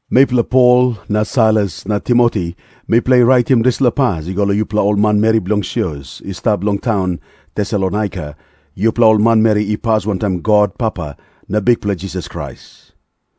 Mipela Pol na Sailas na Timoti, mipela i raitim dispela pas i go long yupela ol manmeri bilong sios i stap long taun Tesalonaika, yupela ol manmeri i pas wantaim God Papa na Bikpela Jisas Krais.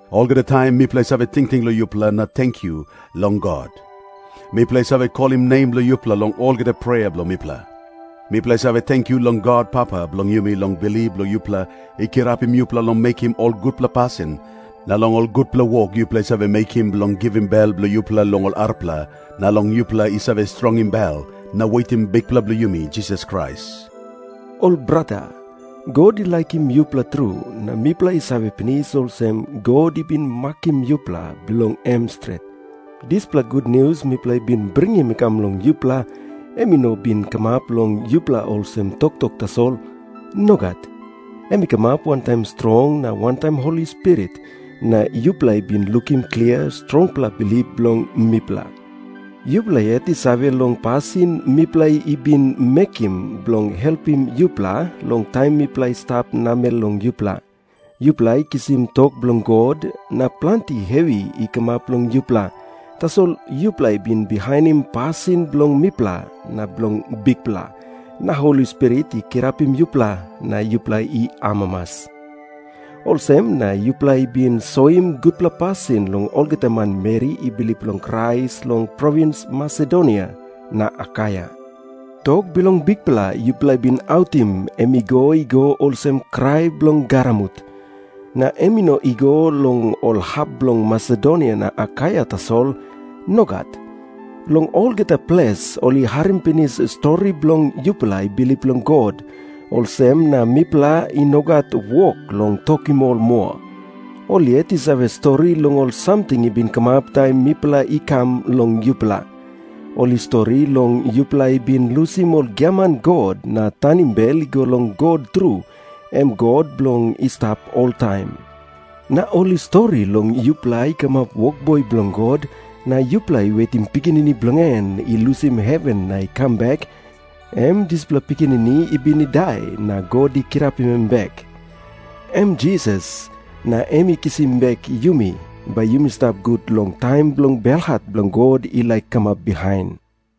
Olgeta taim mipela i save tingting long yupela na tenkyu long God. Mipela i save kolim nem bilong yupela long olgeta prea bilong mipela. Mipela i save tenkyu long God Papa bilong yumi long bilip bilong yupela i kirapim yupela long mekim ol gutpela pasin, na long ol gutpela wok yupela i save mekim bilong givim bel bilong yupela long ol arapela, na long yupela i save strongim bel na wetim Bikpela bilong yumi Jisas Krais. Ol brata, God i laikim yupela tru, na mipela i save pinis olsem, God i bin makim yupela bilong em stret. Dispela gutnius mipela i bin bringim i kam long yupela, em i no bin kamap long yupela olsem toktok tasol. Nogat. Em i kamap wantaim strong na wantaim Holi Spirit, na yupela i bin lukim klia strongpela bilip bilong mipela. Yupela yet i save long pasin mipela i bin mekim bilong helpim yupela long taim mipela i stap namel long yupela. Yupela i kisim tok bilong God, na planti hevi i kamap long yupela, tasol yupela i bin bihainim pasin bilong mipela na bilong Bikpela, na Holi Spirit i kirapim yupela na yupela i amamas. Olsem na yupela i bin soim gutpela pasin long olgeta manmeri i bilip long Krais long provins Masedonia na Akaia. Tok bilong Bikpela yupela i bin autim, em i go i go olsem krai bilong garamut. Na em i no i go long ol hap bilong Masedonia na Akaia tasol. Nogat. Long olgeta ples ol i harim pinis stori bilong yupela i bilip long God, olsem na mipela i no gat wok long tokim ol moa. Ol yet i save stori long ol samting i bin kamap taim mipela i kam long yupela. Ol i stori long yupela i bin lusim ol giaman god na tanim bel i go long God tru, em God bilong i stap oltaim. Na ol i stori long yupela i kamap wokboi bilong God, na yupela i wetim Pikinini bilong en i lusim heven na i kam bek, em dispela Pikinini i bin i dai na God i kirapim em bek. Em Jisas, na em i kisim bek yumi, bai yumi stap gut long taim bilong belhat bilong God i laik kamap bihain.